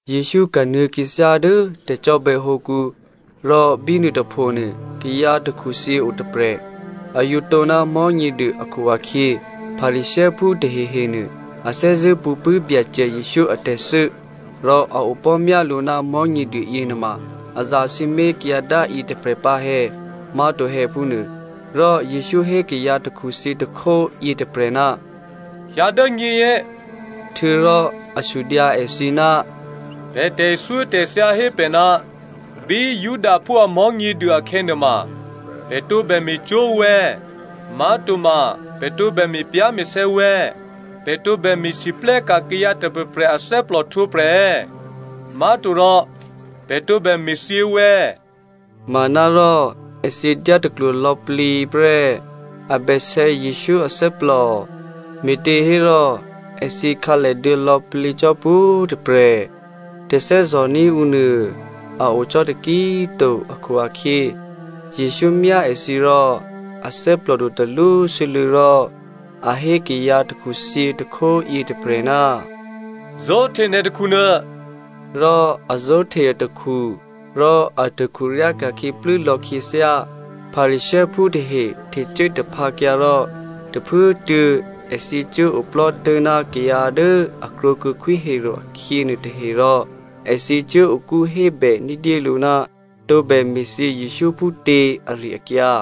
Jesǔ kanuô̌ khyěthyá dố tè̤cò́bè̌hǒkǔ rò bínuô tôphonuô, kayǎ takhuthyě o tôprè̤. A yǒ tǒ ná Mò̤́nyěduô akhu-akhyě, Pharisěophú tahehenuô a thè́zṳ̂́ pṳ̌ pṳ̂́ Byacè Jesǔ atè̤thû́ rò a opò̤́ myá lǔ ná Mò̤́nyěduô yěnuôma a zasǐmé̤ kayǎ dá yětôprè̤ pǎ è̌, ma to è̌ phúnuô. Rò Jesǔ hé kayǎ takhuthyě tôkhó yětôprè̤, “Hyǎ dố nyěyě.” Htuô̌rò a sudyǎ èthǐ, “Pè̤ tè̤thyótè̤thya hé pè̤ ná bí Judaphú a Mò̤́nyěduô akhè̌nuôma, pè̤ tǒbè me̤cwó̤ ǔ è̌? Má̤toma pè̤ tǒbè me̤pyá̤me̤sè̌ ǔ è̌? Pè̤ tǒbè me̤lwóhteka̤ kayǎ tôprè̤prè̤ athè́plò htwǒprè̤ è̌? Má̤torò pè̤ tǒbè me̤thyě ǔ è̌?” Manárò èthǐ dyátaklwo lò̌plǐ prè́. A bèsè̌ Jesǔ athè́plò, me̤těhérò èthǐ khǎlèduô̌ lò̌plǐ cò́ pwǒ̤꤮ tôprè̤, tè̤thè́zò̤ní̤ ǔnuô a o cò́ taki꤮ to akhu-akhyě, Jesǔ myá èthǐ rò a thè́plòdu talwósû́lû̌ rò a hé kayǎ takhuthyě tôkhó yětôprè̤, “Zó̤hte nè̤ takhunuô,” rò a zó̤hte atakhu, rò atakhu ryáka̤khyě plû́lò̌ khyěthyá. Pharisěophú tahe htecuố taphǎkyǎ rò tôphuốtuô̌ èthǐ cuốoplò́ tố̤ná kayǎ dố a krwǒkuô̌ Khwí Herodè akhyě nuôtahe rò èthǐ cuố okú hébè ní̤dyélǔ ná tǒbè me̤thyě Jesǔ phútě ari-akyǎ.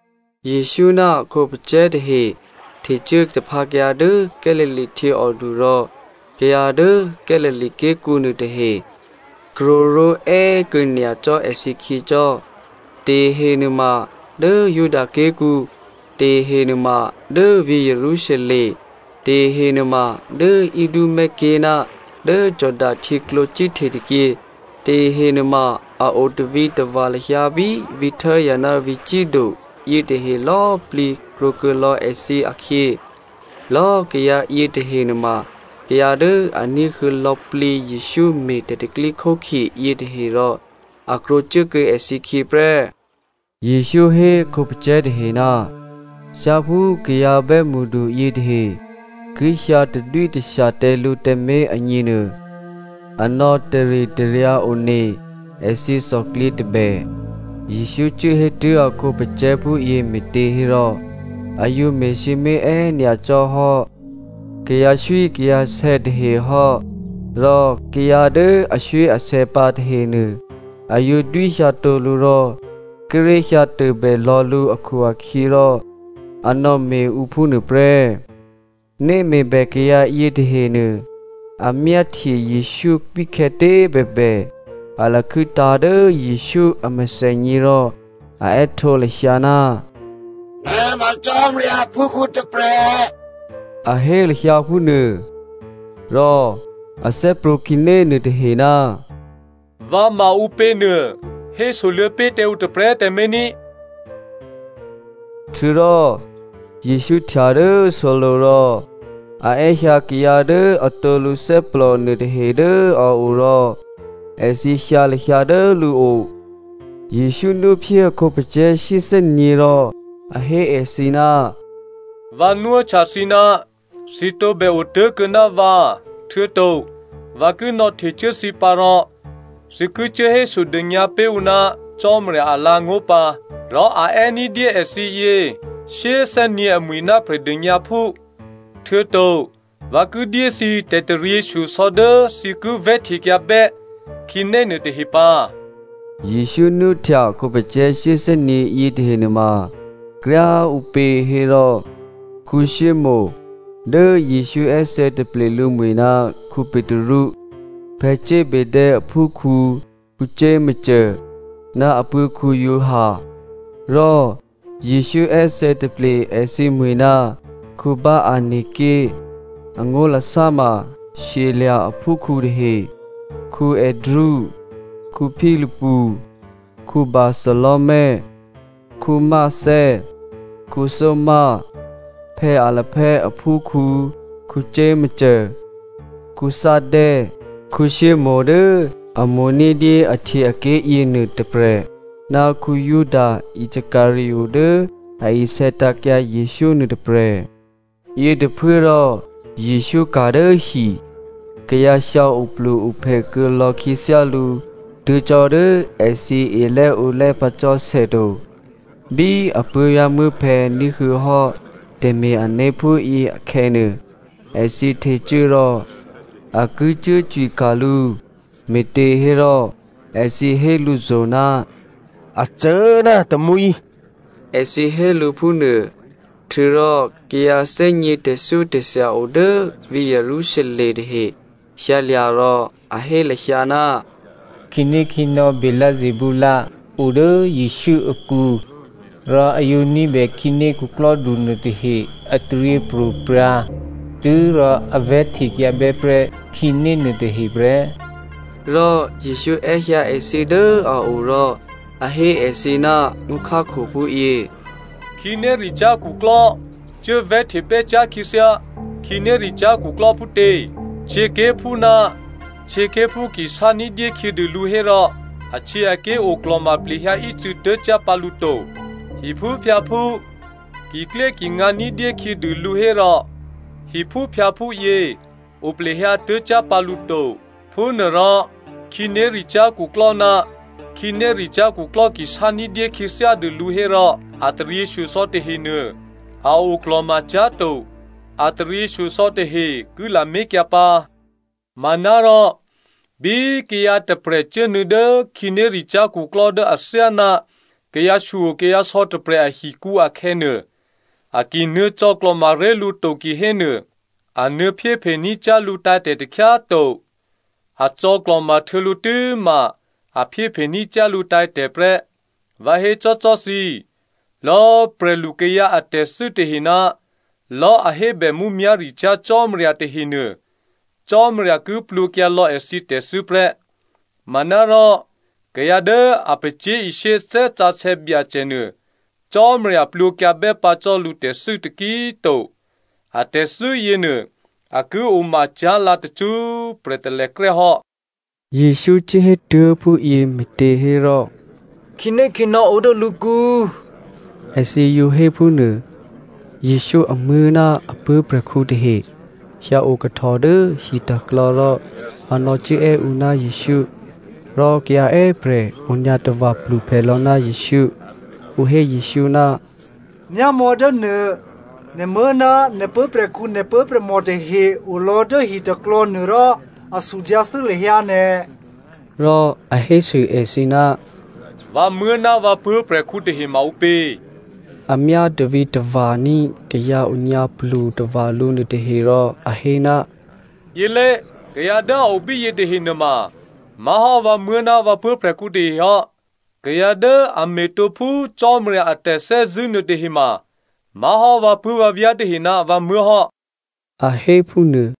Jesǔ ná a khǒpacè̤̌ tahe htecuố taphǎkyǎ dố Galilea htyěòdu rò kayǎ dố Galilea ké̤kǔ nuôtahe krwǒ ró̤è́꤮ kuô̌ nyacò́ èthǐkhyěcò́. Tahehe nuôma dố Juda ké̤kǔ, tahehe nuôma dố vǐ̤ Jerusalem, tahehe nuôma dố Idumea ké̤ ná dố Jordano htyěklǒ cíhte tôkyě, tahehe nuôma a o tavǐtava̤ lahyǎ bí vǐ̤ Tyre ná vǐ̤ Sido yěnuôtahe lò̌꤮ plǐ krwǒkuô̌ lò̌ èthǐ akhyě. Lò̌꤮ kayǎ yětahe nuôma kayǎ dố a ní̤huô̌ lò̌plǐ Jesǔ me̤ tè̤pro̤tè̤prya̤ yětahe rò a krwǒcuốkuô̌ èthǐkhyě prè́. Jesǔ hé a khǒpacè̤̌ tahe ná thyáphú kayǎ bè́mṳdu yětahe ki hyǎ tadwítashya tǎ lǔ tǎmé̤ agněnuô, a nò̌taritaryǎ one èthǐ thòklyě tôbè. Jesǔ cuố hétuố̤ a khǒpacè̤̌ phúyě me̤těhérò a yǒ me̤sǐmé̤ è́nyacò́ hò́ kayǎswíkayǎsè̌ tahe hò́, rò kayǎ dố aswíasè̌ pǎ tahenuô, a yǒ dwíhyǎtǒ lǔ rò kíré̤ hyǎ tôbè lò̌ lǔ akhu-akhyěrò a nò̌me̤ ǔ phúnuô prè́. Né me̤bè kayǎ yětahenuô, a myáhtye Jesǔ bíkhè̌tě꤮ bèbè, a lakhû́tǎ̤ dố Jesǔ a mèthènyě rò a è́htǒ lahyǎ, “Nè̤ ma Cò́marya aphúkhǔ tôprè̤,” a hé lahyǎ phúnuô. Rò a thè́prwǒ̤ khǐné nuôtahe, “Vǎ ma ǔpěnuô hésoluô̌ pé̤ tǎ ǔ tôprè̤꤮ tǎmé̤ ní꤮.” Htuô̌rò Jesǔ htya dố solo̤ rò a è́hyǎ kayǎ dố atǒ lǔthè́plò nuôtahe dố a o rò èthǐ hyǎ lahyǎ dố lǔo. Jesǔ nwóphyé a khǒpacè̤̌ shyéthè́nyě̤ rò a hé èthǐ, “Vǎ nwóhtya thǐ ná thǐ tǒbè otố̤kuô̌ ná vǎ htuô̌to vǎ ki nò̌htecuố thǐ pǎ rò thǐ ki cuốhésodônyǎ pé̤ ǔ ná Cò́marya alǎ̤angó̤ pǎ. Rò a è́ ní̤dyé èthǐ yě shyéthè́nyě̤ amwi̤ ná Prè̤dônyǎphú. Htuô̌to vǎ ki dyé thǐ tè̤taryěshyosò̌ dố thǐ ki vè̤́htekyǎbè́ khǐné nuôtahe pǎ.” Jesǔ nwóhtya a khǒpacè̤̌ shyéthè́nyě̤ yětahe nuôma kryá꤮ ǔpě hé rò, Simonè (Dố Jesǔ è́thè̌taple lǔmwi̤ ná Petru) Zebedeo aphúprè̤khǔ Jakomo ná apuố̤ Giovanni, rò Jesǔ è́thè̌taple èthǐmwǐ̤ ná Boanerge. Angó̤lasá ma shyelya̤ a phúprè̤khǔ tahe. Andrea, Philipu, Bartholomeo, Matteo, Thomazo, Alphaeo aphúkhǔ Jakomo, Thaddeo, Simonè dố a mo̤ ní̤dyé ahtyěaké̤ yěnuô tôprè̤, ná Juda Iscariot dố a isè̌tǎ̤kyǎ Jesǔ nuôtôprè̤. Yětôphuốrò Jesǔ ka̤ dố hi. Kayǎ hyǎ oplu-ophè kuô̌lò̌ khyěthyálǔ tuố̤ cò́ dố èthǐ elè́ǒlè́ pǎ cò́ sè to. Bí a puố̤vyá̤muố̤phè̌ ní̤huô̌ hò́ tè̤me̤-ané̤ phúyě akhè̌nuô, èthǐ htecuố rò a ki cuố cwika̤ lǔ me̤těhérò èthǐ hé lǔzo̤, “A cô ná a tamwǐ,” èthǐ hé lǔ phúnuô. Htuô̌rò kayǎ thè́gně tè̤thyótè̤thya o dố vǐ̤ Jerusalem tahe hyǎlya̤ rò a hé lahyǎ, “Khǐnékhǐnò̌ Beelzebul o dố Jesǔ akǔ, rò a yǒ ní̤bè khǐné khuklò́du nuôtahe a taryěpro̤prya̤ tû́rò a vè̤́htekyǎ bè́ prè́ khǐné nuôtahe prè́.” Rò Jesǔ è́hyǎ èthǐ dố a o rò a hé èthǐ ná ngó̤khákho phúyě, “Khǐnéricyá̤ khuklò́ cuố vè̤́htebè́ cyá̤ khyěthyá khǐnéricyá̤ khuklò́ phútě? Htyěké̤phú ná htyěké̤phú ki sá ní̤dyé khyědû lǔ hérò ahtyěaké̤ oklò̤ma plehyǎ ícû̌ tố̤cyá̤ pǎ lǔ to. Hiphúphyǎphú kiklyékingǎ ní̤dyé khyědû lǔ hérò hiphúphyǎphú yě o plehyǎ tố̤cyá̤ pǎ lǔ to. Phúnuôrò khǐnéricyá̤ khuklò́ ná khǐnéricyá̤ khuklò́ ki sá ní̤dyé khyěthyádûlǔ hérò a taryěshyosò̌ tahenuô, a oklò̤ma cyá̤to. A taryěshyosò̌ tahe ki lamé̤kyǎ pǎ. Manárò bí kayǎ tôprè̤ cuốnuô̌ dố khǐnéricyá̤ khuklò́ dố athyáná kayǎshyokayǎsò̌ tôprè̤ ahikǔ akhè̌nuô, a ki nuô̌ cò̌klò̤ma ré̤ lǔ to kihénuô, a nuô̌ phyéphení̤ cyá̤ lǔtǎ̤tè̤ takhyá꤮ to. A cò̌klò̤ma htuô̌ lǔ tû́ma a phyéphe ní̤ cyá̤ lǔ tǎ̤tè̤ prè́. Vǎ hécò́cò́ thǐ, lò̌꤮ prè̤lukayǎ a tè̤thû́ tahe ná lò̌꤮ a hébè mǔmyá̤ricyá̤ Cò́marya tahenuô Cò́marya ki plwǒkyǎ lò̌ èthǐ tè̤thû́ prè́. Manárò kayǎ dố a pacyé̤ishyé Thè́ Sǎsè̌ Byacè nuô Cò́marya plwǒkyǎbè́ pǎ cò́ lǔtè̤thû́ taki꤮ to. Atè̤thû́ yěnuô a ki omacyá̤ lǎ tacṳ́prè̤ talèkrè́ hò́.” Jesǔ cuốhétuố̤ phúyě me̤těhérò, “Khǐnékhǐnò̌ o dố lǔkǔ,” èthǐ yǒ hé phúnuô. Jesǔ amuố̤ ná a puố̤prè̤khǔ tahe hyǎo kahtò dố hiklò̌ rò a nò̌cuốè́ ǔ ná Jesǔ. Rò kayǎ è́prè̤ onyǎ tava̤ pluphè lò̌ ná Jesǔ. Ǔ hé Jesǔ, “Myámò̌ dố nuô, nè̤muố̤ ná nè̤ puố̤prè̤khǔ nè̤ puố̤prè̤mò tahe olò̌ dố hiklò̌nuô rò a sudyǎthû́ lahyǎ nè̤.” Rò a hésû èthǐ, “Vǎmuố̤ ná vǎ puố̤prè̤khǔ tahema ǔpě?” A myá tavǐtava̤ní̤ kayǎ onyǎplu tava̤ lǔ nuôtahe rò a hé, “Yělé, kayǎ dố a o bíyě tahe nuôma má̤hò́ vǎmuố̤ ná vǎ puố̤prè̤khǔ tahehò́. Kayǎ dố a me̤tǒ phú Cò́marya a tè̤thè́zṳ̂́ nuôtahema má̤hò́ vǎpuố̤vǎvyá̤ tahe ná vǎmuố̤ hò́,” a hé phúnuô.